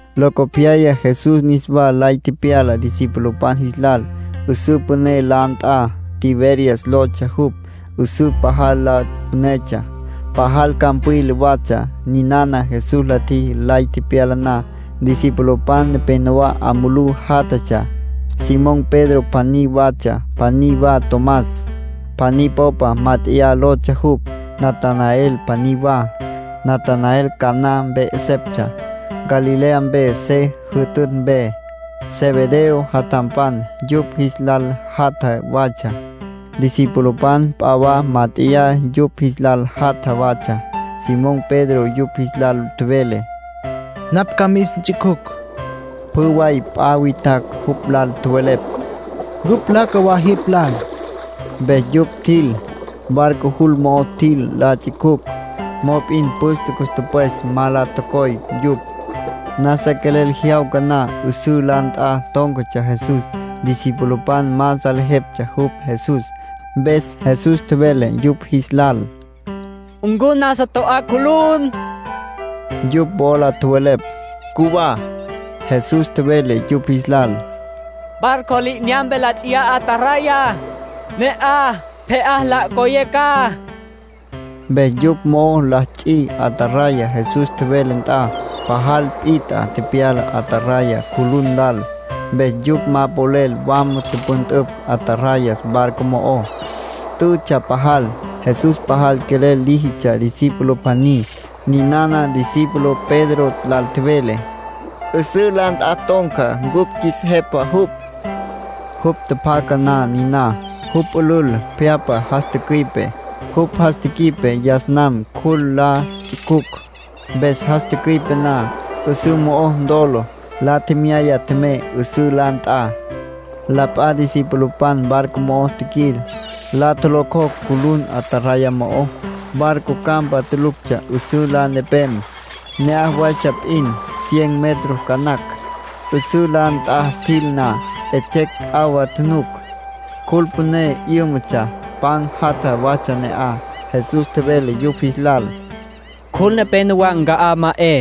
Locopyaya Jesús niswa lay tepyala discipulopan jis lal, 'üsǘ püné la nt'a. Tiberias lotsja jupj, 'üsǘ. Pajal la pünetsja, pajal campwila watsja. Ninana Jesús la tjiji lay tepyala na. Discipulopan nepenowá 'a mulú játjatsja. Simón Pedro pjaní watsja, pjaní wa Tomás (“Pjaní Popa Mát'eya” lotsja jupj), Natanael pjaní wa. Natanael Caná mpe 'eseptsja, Galilea mpe se jütütj mpe. Zebedeo jatjampan yupj jis lal jatja watsja. Discipulopan p'a wa mát'eya yupj jis lal jatja watsja. Simón Pedro yupj jis lal tjevele: —Napj ca mis nts'icjucj. Pjü way p'a witjacj jupj lal tjowelepj: —Ncupj ca nlaca wa jipj lal. Mpes yupj tjil. Barco jul mo'o tjil la ts'icjucj; mop'in püste cus tüpwes ma la tocoy yupj. Nasa quelel jyawca na, 'üsǘ la nt'a tón̈catsja Jesús. Discipulopan ma salejeptsja jupj Jesús. Mpes Jesús tjevele yupj jis lal: —¿Ncu nasa to'á cjulun? Yupj wola tjowelepj: —Cjuwá. Jesús tjevele yupj jis lal: —Barco li'inyampe la ts'iyá ataraya. Ne'aj pje'á la ncoyé ca. Mpes yupj mo'o la ts'i ataraya Jesús tjevele nt'a. Pajal pit'a tepyala ataraya cjulun lal, mpes yupj ma polel wama tüpüntüpj atarayas barco mo'ó. Tütsja pajal. Jesús pajal quelel líjitsja discípulo pjaní. Ninana discípulo Pedro lal tjevele: —'Üsǘ la nt'a ton̈ca ncupj qjuis Jepa jupj. Jupj tjapjaca na niná, jupj pülül pje'apa jas tücüi'pe. Jupj jas tji'ipje yas nam cjul la ts'icjucj. Mpes jas tücüi'pe na, 'üsǘ mo'o ntolo, la tjemyaya tjemey 'üsǘ la nt'a. La p'a discipulopan barco mo'o tjiquil, la tjolocjocj cjulun ataraya mo'ó. Barco campa tuluctsja 'üsǘ la nepem. Ne'aj waytsja p'in, cien metro ca nacj. 'Üsǘ la nt'a tjil na, 'etsjecj 'awa tjunuc. Cjul püné 'yǘmatsja, pan jatja watsja ne'aj. Jesús tjevele yupj jis lal: —Cjul nepénowa nca'á ma 'e,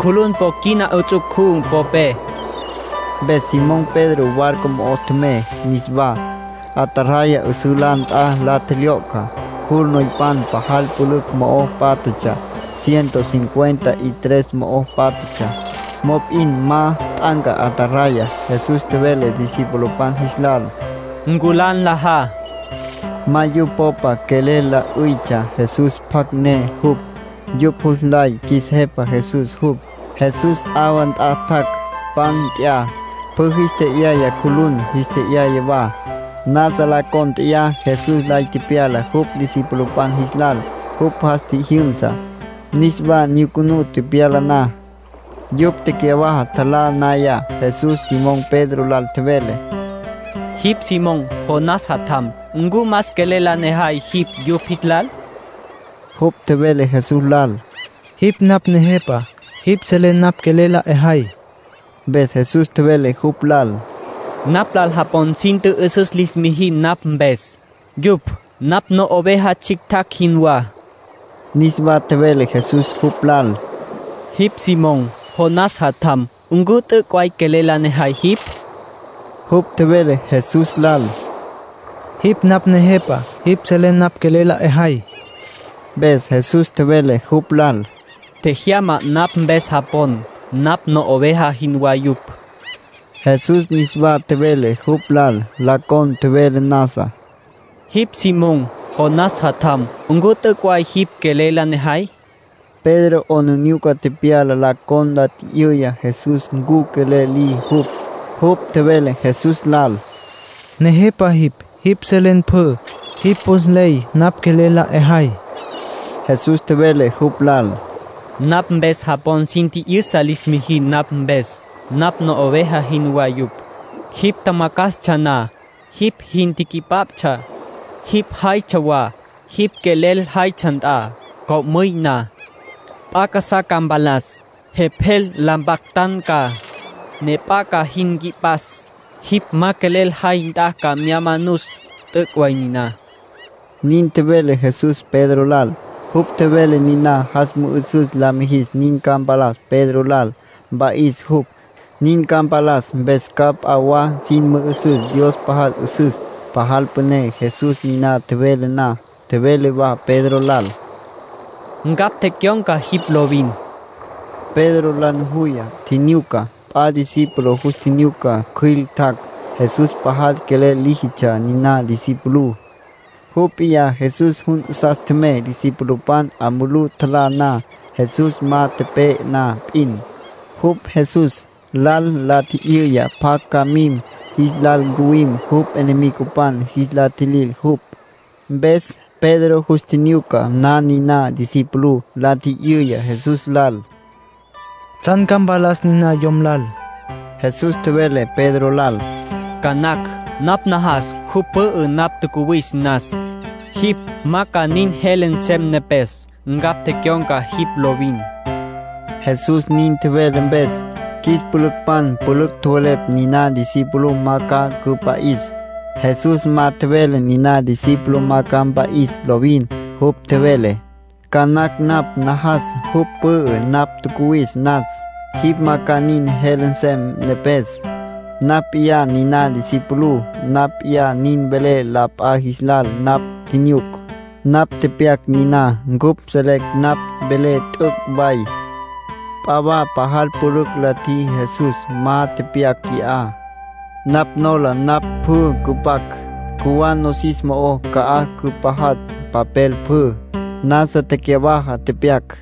cjulun po quina 'its'u'cú popé. Mpes Simón Pedro barco mo'o tjemey niswá, ataraya 'üsǘ la nt'a la tjelyo'cja. Cjul noypan pajal pülücj mo'o pátjatsja, ciento cincuenta y tres mo'o pátjatsja. Mop'in ma t'anca ataraya. Jesús tjevele discipulopan jis lal: —Nculá nlajá. Ma yupj popa quelel la 'üytsja Jesús pjacj ne jupj. Yupj jus nlay qjuis Jepa Jesús jupj. Jesús 'awa nt'a tjac', pan nt'ya, pjü jis tje'yaya. Cjulun jis tje'yaya wa. Nasa la cónt'eya Jesús lay tepyala jupj discipulopan jis lal, jupj jas tjijyünsa, niswa nyucunú tepyala na. Yupj tecyawaja tjalá naya, Jesús Simón Pedro lal tjevele: —Jipj Simón, Jonás jatjam. ¿Ncu más quelel la nejay jipj yupj jis lal? Jupj tjevele Jesús lal: —Jipj napj Nejepa. Jipj selen napj quelel la 'ejay. Mpes Jesús tjevele jupj lal: —Napj lal japon sin tjü'üsüs lis mijin napj mpes. Yupj napj no'oveja tsjictjacj jinwá. Niswa tjevele Jesús jupj lal: —Jipj Simón, Jonás jatjam. ¿Ncu t'üc' way quelel la nejay jipj? Jupj tjevele Jesús lal: —Jipj napj Nejepa. Jipj selen napj quelel la 'ejay. Mpes Jesús tjevele jupj lal: —Tjejyama napj mpes japon. Napj no'oveja jinwá yupj. Jesús niswa tjevele jupj lal, la con tjevele nasa: —Jipj Simón, Jonás jatjam. ¿Ncu t'üc' way jipj quelel la nejay? Pedro 'aplijila tepyala la con la tji'yüya Jesús ncu quelel liji jupj. Jupj tjevele Jesús lal: —Nejepa jipj. Jipj selen pjü. Jipj jus nley napj quelel la 'ejay. Jesús tjevele jupj lal: —Napj mpes japon sin tji'yüsa lis mijin napj mpes. Napj no'oveja jinwá yupj. Jipj tjamacjastsja na, jipj jin quipaptsja, jipj jaytsja wa jipj quelel jaytsja nt'a. Co'müy na, p'a casá ca mpalas. Jepjel la mpactan ca, ne p'a ca jin nqui'pas. Jipj ma quelel jay nt'a ca mya manus. T'üc' way niná —nin tjevele Jesús Pedro lal. Jupj tjevele niná jas mü'üsüs la mijis nin ca mpalas Pedro lal, mpa'is jupj. Nin ca mpalas mpes ca p'a wa sin mü'üsüs Dios pajal 'üsüs, pajal püné. Jesús niná tjevele na, tjevele wa Pedro lal: —Ncapj tecyon̈ca jipj lovin. Pedro la nujuya, tjinyuca. P'a discípulo jus tjinyuca cjüil tjac'. Jesús pajal quelel líjitsja niná discipulú. Jupj p'iyá Jesús jun 'asas tjemey discipulopan 'a mulú tjalá na, Jesús ma tepe'e na p'in. Jupj Jesús lal la tji'yüya pjacj ca mim jis lal ncuwim jupj enemigopan jis la tjilil jupj. Mpes Pedro jus tjinyuca na niná discipulú, la tji'yüya Jesús lal: —¿Tsjan ca mpalas niná yom lal? Jesús tjevele Pedro lal: —Ca nacj napj najas jupj pü'ü napj tjacuwis nas. Jipj ma ca nin jele nsem nepes. Ncapj tecyon̈ca jipj lovin. Jesús nin tjevele mpes, qjuis pülücpan pülücj tjowelepj niná discípulo ma ca cüpa'is. Jesús ma tjevele niná discípulo ma ca mpa'is lovin. Jupj tjevele: “Ca nacj napj najas jupj pü'ü napj tjacuwis nas. Jipj ma ca nin jele nsem nepes.” Napj p'iyá niná discipulú. Napj p'iyá nin velé la p'a jis lal napj tjinyuc. Napj tepyac niná. Cupj selecj napj velé t'üc' way. P'a wa pajal pülücj la tjiji Jesús, ma tepyac qui'á. Napj nola napj pjü cüpac, cjuwá nosis mo'ó ca'aj cüpajatj papel pjü. Nasa tecyawaja tepyac.